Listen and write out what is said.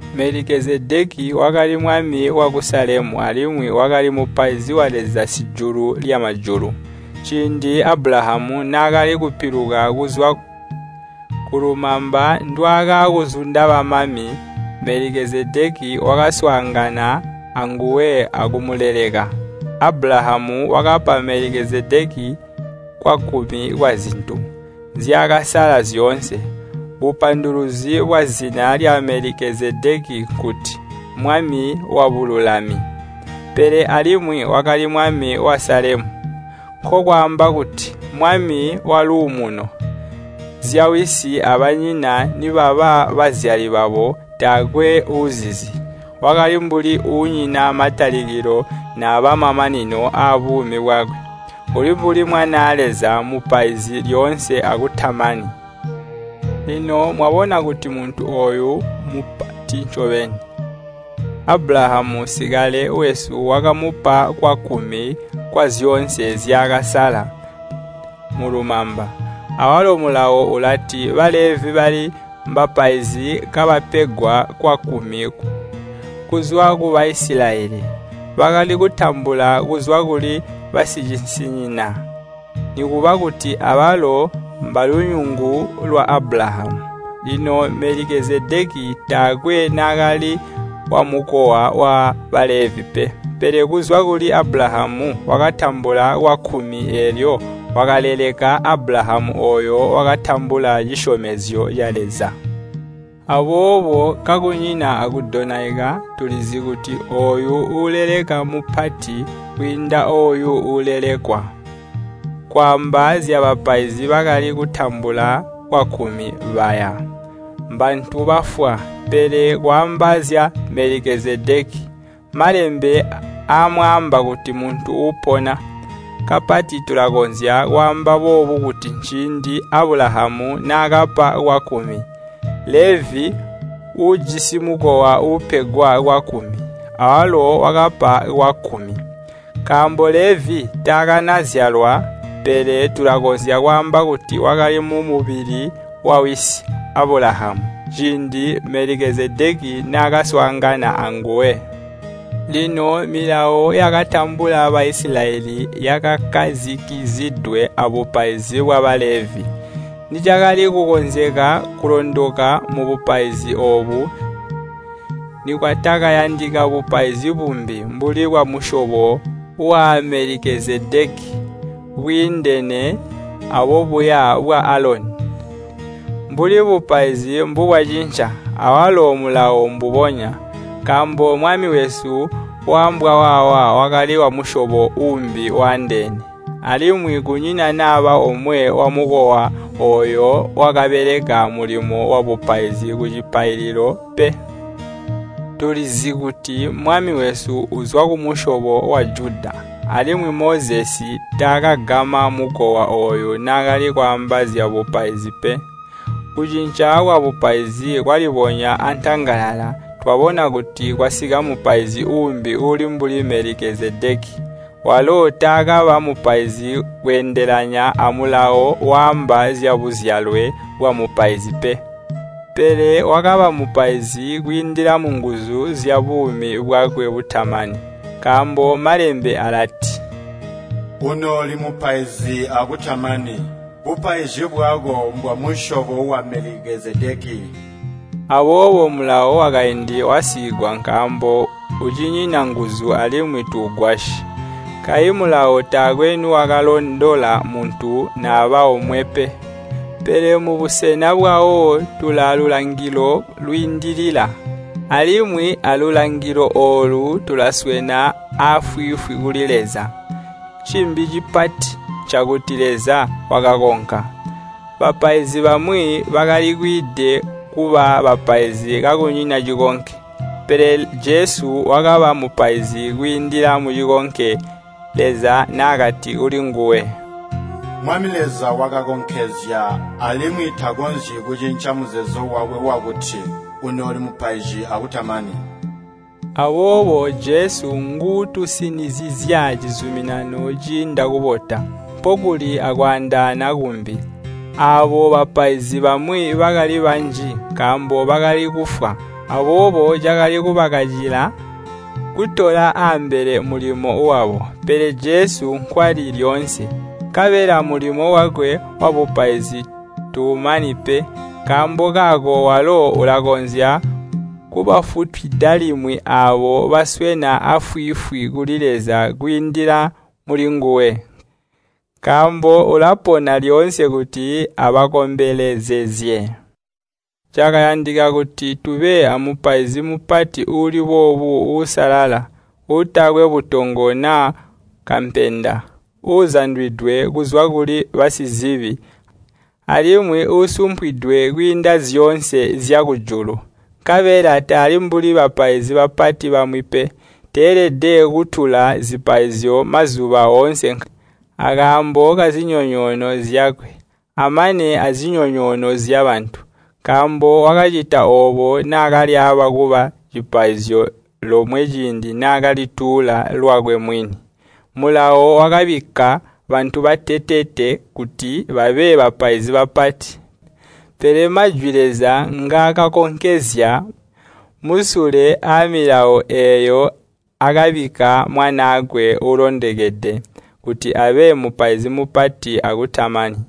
Melikezedeki wakali mwami waku Salemu alimwi wakali mupaizi wa Leza Sijulu lyamajulu. Ciindi Abulahamu naakali kupiluka kuzwa kulumamba ndwaakaakuzunda bamami, Melikezedeki wakaswaangana anguwe akumuleleka. Abulahamu wakapa Melikezedeki kwakkumi kwazintu nzyaakasaala zyoonse. Bupanduluzi bwazina lya Melikezedeki nkuti “Mwami wa Bululami.” Pele alimwi wakali Mwami wa Salemu, nkokwaamba kuti “Mwami wa Luumuno.” Zyawisi abanyina nibaba bazyali babo taakwe uuzizi. Wakali mbuli uunyina matalikilo naaba mamanino aabuumi bwakwe. Uli mbuli Mwanaa Leza, mmupaizi lyoonse akutamani. Lino mwabona kuti muntu ooyu Mmupati ncobeni! Abulahamu sikale wesu wakamupa kwakkumi kwazyoonse nzyaakasaala mulumamba. Awalo Mulawo ulati Balevi bali mbapaizi kabapegwa kwakkumi kuzwa ku Baisilayeli. Bakali kutambula kuzwa kuli basicisinyina, nikuba kuti abalo mbalunyungu lwa Abulahamu. Lino Melikezedeki taakwe naakali wamukowa wa Balevi pe, pele kuzwa kuli Abulahamu wakatambula kwakkumi eelyo wakaleleka Abulahamu ooyo wakatambula cisyomezyo ca Leza. Aboobo kakunyina akudonaika, tulizi kuti ooyo uuleleka mmupati kwiinda ooyo uulelekwa. Kwaamba zyabapaizi bakali kutambula kwakkumi baya, mbantu bafwa. Pele kwaamba zya Melikezedeki, Malembe amwaamba kuti muntu uupona. Kapati tulakonzya kwaamba boobu kuti ciindi Abulahamu naakapa kwakkumi, Levi (uujisi mukowa uupegwa kwakkumi) awalo wakapa kwakkumi. Nkaambo Levi taakanazyalwa, pele tulakonzya kwaamba kuti wakali mumubili wawisi Abulahamu, ciindi Melikezedeki naakaswaangana anguwe. Lino milawo yakatambula Baisilayeli yakakkazikizidwe abupaizi bwa Balevi. Nicakali kukonzeka kulondoka mubupaizi oobu, nikwatakayandika bupaizi bumbi mbuli bwamusyobo wa Melikezedeki, bwiindene abobuya bwa Aloni. Mbuli bupaizi mbubwacinca, awalo Mulawo mbubonya. Nkaambo Mwami wesu waambwa waawa wakali wamusyobo uumbi waandeene. Alimwi kunyina naba omwe wamukowa ooyo wakabeleka mulimo wabupaizi kucipaililo pe. Tulizi kuti Mwami wesu uzwa kumusyobo wa Juda, alimwi Mozesi taakagama mukowa ooyo naakali kwaamba zyabupaizi pe. Kucinca kwabupaizi kwalibonya antangalala, twabona kuti kwasika mupaizi uumbi uuli mbuli Melikezedeki. Walo taakaba mupaizi kweendelana amulawo waamba zyabuzyalwe bwabupaizi pe. Pele wakaba mupaizi kwiindila munguzu zyabuumi bwakwe butamani. Nkaambo Malembe alati, “Unooli Mupaizi akutamani. Bupaizi bwako mbwamusyobo wa Melikezedeki.” Aboobo mulawo wakaindi wasiigwa nkaambo ucinyina nguzu alimwi tuugwasyi. Kayi Mulawo taakwe niwakalondola muntu naba omwe pe. Pele mubusena bwawo tulaalulangilo lwiindilila, alimwi alulangilo oolu tulaswena aafwiifwi kuli Leza. Cimbi cipati ncakuti Leza wakakonka. Bapaizi bamwi bakali kwiide kuba bapaizi kakunyina cikonke. Pele Jesu wakaba Mupaizi kwiindila mucikonke, Leza naakati kulinguwe, “Mwami Leza wakakonkezya, alimwi takonzyi kucinca muzeezo wakwe wakuti, ‘Unooli mupaizi akutamani.’” Aboobo Jesu nguutusinizizya cizuminano ciinda kubota. Mpokuli akwaandaana kumbi. Aabo bapaizi bamwi bakali banji, nkaambo bakali kufwa. Aboobo cakali kubakacila kutola aambele mulimo wabo. Pele Jesu nkwali lyoonse, nkabela mulimo wakwe wabupaizi tuumani pe. Nkaambo kaako walo ulakonzya kubafutwida limwi aabo baswena aafwiifwi kuli Leza kwiindila mulinguwe, nkaambo ulapona lyoonse kuti abakombelezezye. Cakayandika kuti tube a Mupaizi Mupati uuli boobu uusalala, uutakwe butongo naa kampenda, uuzandwidwe kuzwa kuli basizibi, alimwi uusumpwidwe kwiinda zyoonse zyakujulu. Nkabela tali mbuli bapaizi bapati bamwi pe. Teelede kutuula zipaizyo mazuba oonse akaambo kazinyonyoono zyakwe, amana azinyonyoono zyabantu. Nkaambo wakacita oobo naakalyaaba kuba cipaizyo lomwe ciindi naakalituula lwakwe mwini. Mulawo wakabikka bantu bateteete kuti babe bapaizi bapati. Pele majwi Leza ngaakakonkezya musule aamilawo eeyo akabikka Mwanaakwe uulondokede, kuti abe Mupaizi Mupati akutamani.